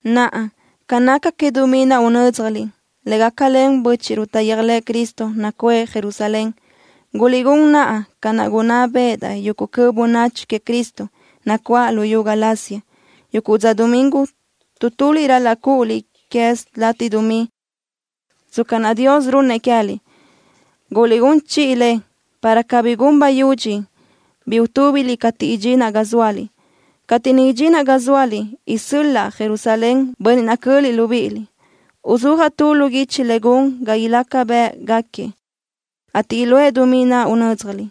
Naʼa, ca naca que dumí naʼ unö́dzjaliʼ, le gácalen bö́chiʼruʼ taʼyéajlëʼë Cristo nacuʼë Jerusalén, guliʼgún naʼa ca naʼ gunná béʼedaʼ yuguʼ cöʼ bönachi queëʼ Cristo, nacuáʼ luyú Galacia. Yuguʼ dza domingo, tu tuliʼ ral-laʼ cúʼuliʼ quez latiʼ dumí, tsca naʼ Dios runnëʼ queë́liʼ. Guliʼgún chiʼi le, para cabí gun bayudxi bi utúbiliʼ cateʼ idxinaʼ ga zóaliʼ. Cateʼ niʼ idxinaʼ ga zóaliʼ, isö́l-laʼa Jerusalén bönniʼ naʼ cöliʼ libíʼiliʼ. Uzúajaʼ tu lu guichi le gun ga ilaca bë́ʼgaquiëʼ, ateʼ iluʼë dumí naʼ unö́dzjaliʼ.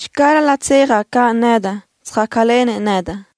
Channö ral-laʼ tsejaʼ caʼ nedaʼ, tsöjácalenëʼ nedaʼ.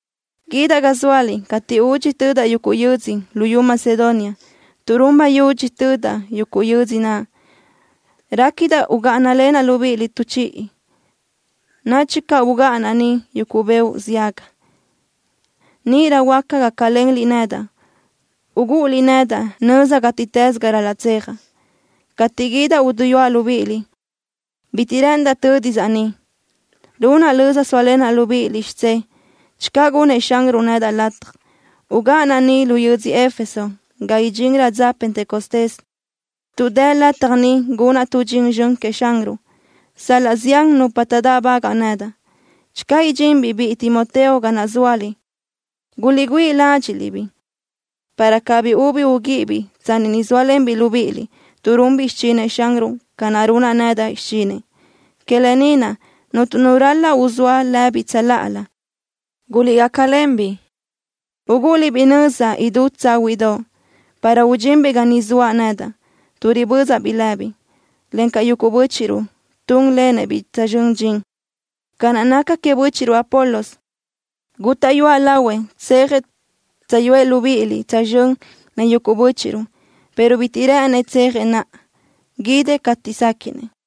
Guídaʼ ga zóaliʼ cateʼ údxi tödaʼ yuguʼ yödzö luyú Macedonia, tuʼ run bayudxi tödaʼ yuguʼ yödzö naʼ. Réquidaʼ ugáʼanalenaʼ libíʼiliʼ tu chiʼi, o nadxi caʼ ugáʼanaʼ niʼ yuguʼ beoʼ ziaga. Níʼirö huáca gácalenliʼ nedaʼ, ugúʼuliʼ nedaʼ nöza gátiʼtës ga ral-laʼ tsejaʼ. Cateʼ guídaʼ uduyúaʼ libíʼiliʼ bitiʼ rë́ʼëndaʼ tö́disaʼ niʼ. Runaʼ löza sóalenaʼ libíʼiliʼ xidzé, channö gunnëʼ Xanruʼ nedaʼ lataj. Ugáʼanaʼ ni lu yödzö Éfeso ga idxinrö dza Pentecostés tuʼ dë lataj ni gunaʼ tu dxin zxön queëʼ Xanruʼ, sal-laʼ zián nupa taʼdáʼbagaʼ nedaʼ. Channö idxinbiʼ biʼi Timoteo ga naʼ zóaliʼ, guliʼgüíʼi ládxiʼliʼ-biʼ, para cabí ubi uguíʼibiʼ tsanni niʼ sóalenbiʼ libíʼiliʼ, tuʼ runbiʼ xichinëʼ Xanruʼ ca naʼ runaʼ nedaʼ xichinëʼ. Que lë ni naʼ, cuntu nu ral-laʼ uzóa lëbiʼ tsöláʼalö. Guliʼgácalen-biʼ, ugúʼuliʼ-biʼ nöza idú tsáhuiʼdoʼ, para udxinbiʼ ga ni zoaʼ nedaʼ, tuʼ ribözaʼ-biʼ lëbiʼ, encaʼ yuguʼ bö́chiʼruʼ túnlenëʼ-biʼ tsözxö́n dxin. Ca naca queëʼ bö́chiʼruʼ Apolos, gútaʼyuaʼ lahuëʼ tsejëʼ tsöjyúëʼ libíʼiliʼ tsözxö́n len yuguʼ bö́chiʼruʼ, pero bitiʼ rë́ʼënëʼ tsejëʼ naʼa. Guídëʼ cateʼ séquiʼnëʼ.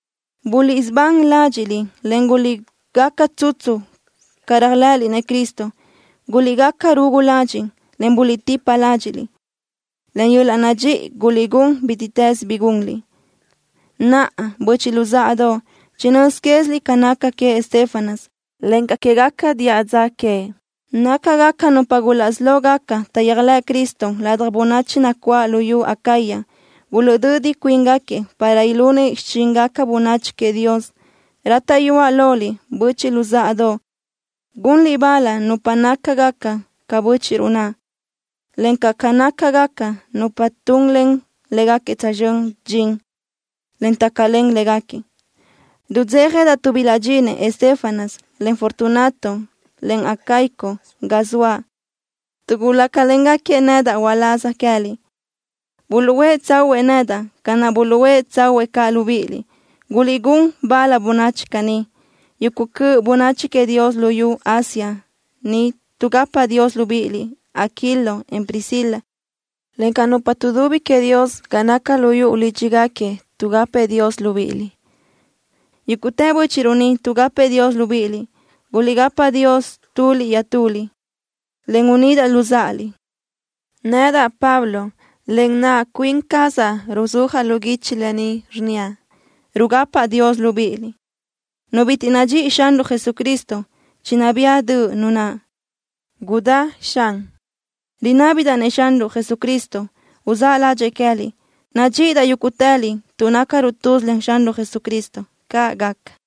Buliʼsubán ládxiʼliʼ, en guliʼgaca tsutsu ca réajlëʼëliʼ-nëʼ Cristo. Guliʼgaca rugu ladxiʼ, en buliʼtipa ládxiʼliʼ. Len yöl-laʼ nadxíʼi guliʼgún bítiʼtës bi gunliʼ. Naʼa, böchiʼ luzáʼadoʼ, chinö́z quéziliʼ ca naca queëʼ Estéfanas, encaʼ quégaca diʼa dza queëʼ. Nácagaca nupa gulaʼsí lógaca taʼyéajlëʼ Cristo ladaj bönachi nacuáʼ luyú Acaya. Buluʼdödi cuíngaquiëʼ para ilunëʼ xichíngaca bönachi queëʼ Dios. Rátaʼyuaʼ loliʼ, böchiʼ luzáʼadoʼ, gunliʼ bal nupa nácagaca ca bö́chiʼruʼ naʼ, encaʼ ca nácagaca nupa tunlen légaquiëʼ tsözxö́n dxin, en tácalen légaquiëʼ. Rudzéjadaʼ tuʼ bilaʼdxinëʼ Estéfanas, en Fortunato, en Acaico ga zoaʼ, tuʼ gúcalengaquiëʼ nedaʼ uláz queë́liʼ. Buluʼhuë́ tsáhuëʼë nedaʼ ca naʼ buluʼhuë́ tsáhuëʼë caʼ libíʼiliʼ. Guliʼgún bal bönachi caní. Yuguʼ cöʼ bönachi queëʼ Dios luyú Asia ni tuʼgapa Dios libíʼiliʼ. Aquilo, en Priscila, encaʼ nupa tuʼdubi queëʼ Dios ga naca lu yuʼu lídxigaquiëʼ tuʼgapëʼ Dios libíʼiliʼ. Yúguʼtë bö́chiʼruʼ ni tuʼgapëʼ Dios libíʼiliʼ. Guliʼgapa Dios tuliʼ iaʼtuliʼ, en unídaʼliʼ luzáʼaliʼ. Nedaʼ, Pablo, len naʼ cuin cazaʼ ruzúajaʼ lu guichi lë ni, rnníaʼ: Rugapaʼ Dios libíʼiliʼ. Nu bitiʼ nadxíʼi Xanruʼ Jesucristo, chinabía döʼ nu naʼ. Gudá Xanruʼ. Rinábidaʼ-nëʼ Xanruʼ Jesucristo uzáʼ ládxëʼë queë́liʼ. Nadxíʼidaʼ yúguʼtëliʼ tuʼ nácaruʼ tuz len Xanruʼ Jesucristo. ¡Caʼ gaca!